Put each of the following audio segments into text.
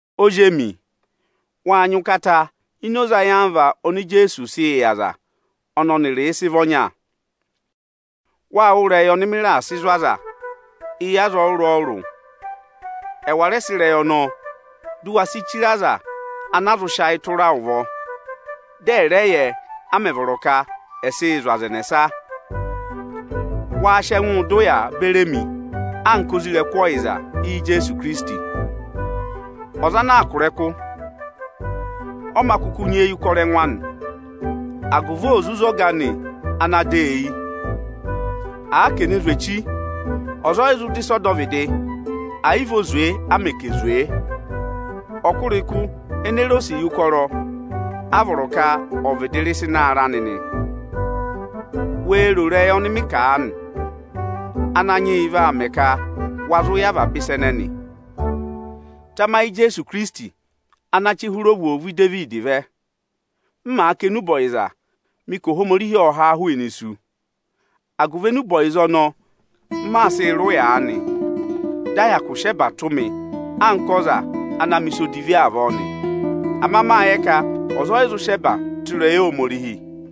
Ozi emi, waa nyị ụkata ini oze ayamva oni Ijeesuū sịị yị aza ọnị ọnịrịị sị vị ọnya. Wâ wụ́ ịrẹyị ọnị mị raà sị zụ̀ aza eyi aza ọrụrụ-ọrụrụ. Ẹ̀wà rẹ sị ịrẹyị ọnọọ, dị u we si chire aza ana á zụ sị ayị tụra ụvọ, dị ẹ́ rẹ yẹ, a mẹ̀ vọrọ ka ẹ̀ sịị zụ̀ aza ẹnẹsa. Waa sị ẹngụụ dọ ụyaa beri emi anka isoja ọyịza Ijeesu Ikirisiti! Ọza ana aa kụ̀ ịrẹkụ, ọ mā kụkụ nyị eyi yị ụkọrọ ẹngụ anị, agụvị ò zụ zé ọga anị ana dọ ọ eyi. Àa ka è ne zwe echi, ọza ọyị zụ dọ ịsa ọdọvịdị, àyị vị o zwe a mẹ̀ ka è ne zwee. Ọkụrịkụ ene re osiye ụkọrọ, a vọrọ ka ọ̀ vịdị rị ịnị ịsa ịnị aarẹ anị nị. Wee ro ịrẹyị ọnị maa kà aanị! Ananyị yị vaa mẹ ka wa zụ yẹ avaba ịsa ẹnẹnị. Tamayị Ijeesu Ikirisiti ana chị hụrẹ ovwoovu Idevidi vẹ! M màa kà enube ọyịza, mị ka Ohomorihi ộ haa hụụnị isu. Agụvị enube ọyịza ọnọọ, m maa sịị rị ụya aanị, dị a hyakụ sị ẹba tụ́ mị anka ọza ana na mẹ̀ ịsa odivi avọọ nị. Ama mâ yẹ ka ọza ọyị zụ sị ẹba tụ́ ịrẹyị Ohomorihi.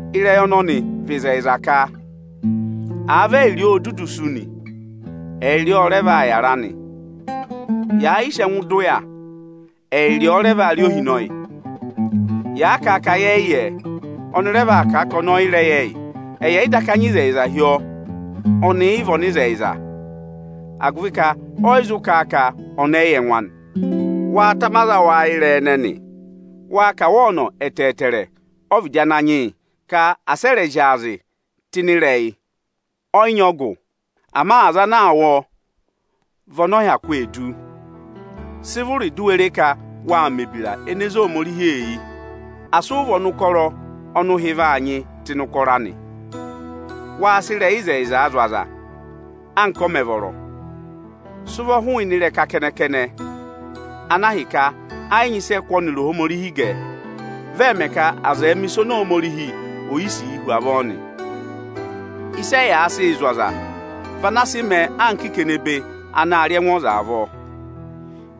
Ịrẹyị ọnọnị vị ịzẹyịza ka: Àa vị ẹyịrị ọọ o dudu sú nị, ẹyịrị ọọ ọ rẹ vaa yàra nị. Yàa yịị sị ẹngụụ dọ ụya, ẹyịrị ọọ rẹ vaa rị ohinọyị. Yàa kà ka yẹ yị yẹẹ, ọnị rẹ vaa kà a ka ọnị ọ yị rẹ yẹ ẹyị. Ẹyị ẹ̀yị daka nyị ịzẹyịza hi ọọ, ọnị yị vị ọnịzẹyịza, agụvị ka ọyị zụ kà a ka ọnị ọyị yẹ ẹngụ anị. Waa tama aza awụ ayị ịrẹyị ẹnẹnị! Waa kà wa ọnọ ẹtẹẹtẹrẹ ọ́vịdị Ananyị yị ka asị ẹ rẹ̀ zyaazị tụ́ ịnị ịrẹyị! Ọ yị nyị ọgụ; ama aza ana aa wụ́ ọọ, vị ọnị ọ hyakụ ee du. Sị vụrị di u we re ka waa mẹ̀ ebira ene zé Ohomorihi eyi! Asị ụ vị ọnụkọrọ ọnị ụhị vaa nyịị tụ́ ịnị ụkọrọ anị! Waa sị ịrẹyị ịzẹyịzaa zụ̀ aza, anka ọ mẹ̀ vọrọ! Sị ụvọ hụụnị ịrẹka kẹnẹ-kẹnẹ ana ahịka ẹ yị nyị ịsị ẹ kụ́ ọnịrị Ohomorihi gẹ. Vị ọọ̄ mẹ ka aza ẹ̀ẹ mẹ ịsa oni Ohomorihi ọ yị sìi hu avọọ nị. Ịsị ẹyaa sịị zụ̀ aza vị ana sị mẹẹ anka ikenebe anaā rị ẹngụ ọza avọọ.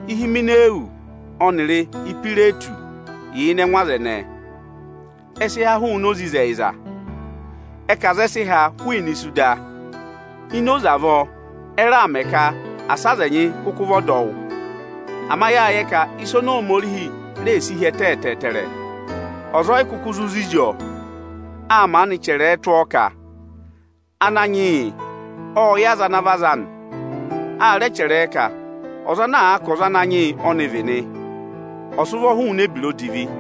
Ihimenawusi ọnịrị Ihwiretusi yà ịnị ẹngụ aza ẹnẹẹ. Ẹ sị há hụụnị oze ịzẹyịza. Ẹ ka aza ẹ sị ha hụụnị isu da. Ini oze avọọ, ẹ raà mẹ ka asị aza ẹnyị kụkụ vị ọdọwụ. Ama yáa yẹ ka ịsị Ohomorihi reè si hi ẹtẹ ẹtẹẹtẹrẹ, ọza o yi kuku zụ zizi ọọ. Â maanị chẹrẹ ẹ tụ́ ọọ ka, “Ananyị yị ộ yẹ aza ana vị aza anị.” A rẹ chẹrẹ ẹ ka, “Ọza ana àa ka ọza Ananyị yị ọ́nị vị nị, ọ̀ sị ụvọ hụụnị ebira odivi.”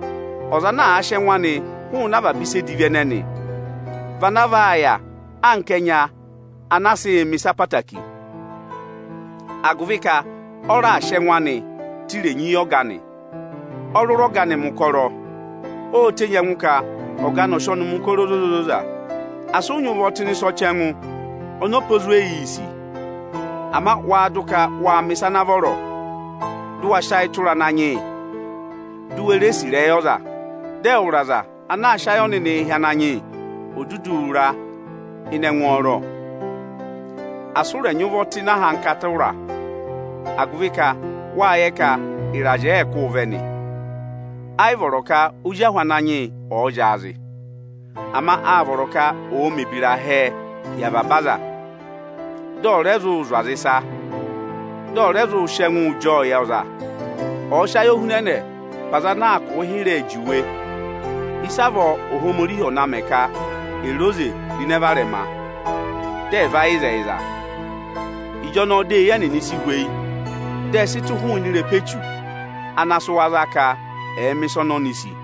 Ọza ana àa sị ẹngụ anị hụụnị avaba ịsa edivi ẹnẹnị, vị ana vaa yà anka ẹnya ana a sịị̄ mẹ̀ ịsa obooro, agụvị ka ọ raà sị ẹngụ anị tụ́ irenyi yị Ọga anị; ọ rụra Ọga anị mẹ̀ ụkọrọ. Óo tenyi ẹngụ ka Ọga anị ọ̀ọ sị ọnịị mẹ̀ ụkọrọ ozoza-ozoza. Asị ụ nyị ụvọ tụ́ ịnị ịsa edivi ọnị ọpa ezweyiī sì, ama wa dụ ka waa mẹ̀ ịsa ana vọrọ, dụ wa sị ayị tụra Ananyị yị, di u we ree sì ịrẹyị ọza, dị ẹwụrị aza ana aa sị ayị ọnịnịị hị́ Ananyị yị ò dudu ra ịnị ẹngwọọrọ! Asị ụ rẹ nyị ụvọ tụ́ ịnị ahankata ụra, agụvị ka wâ yẹ ka ịrazị ẹẹ̄ kụ́ụ vẹ nị. Ayị vọrọ ka ozi ahụ Ananyị yị ọ̀ọ zyaazị. Ama áa vọrọ ka ọ̀ọ mẹ̀ ebira hẹẹ hi avaba aza, dị ọ̀ rẹ zụ zụ̀ aza ịsa, dị ọ̀ rẹ zụụ sị ẹngụụ jị ọọ yị ọza. Ọ̀ọ sị ayohunẹnẹẹ pe aza ana aa kụ̀ụ hịrẹẹ juwe, ịsavọọ Ohomorihi ọ̀ na mẹ ka è re oze ro ịnẹ varẹma, dị ẹ̀ va yẹ ịzẹyịza. Ịjọnọọ dị eyi ẹnịnị si hweyi, dị ẹ sị tụ̀ hụụnị ịrẹpa Echu ana sị wa za ka ẹ̀ẹ mẹ̀ ịsa oni oni sì.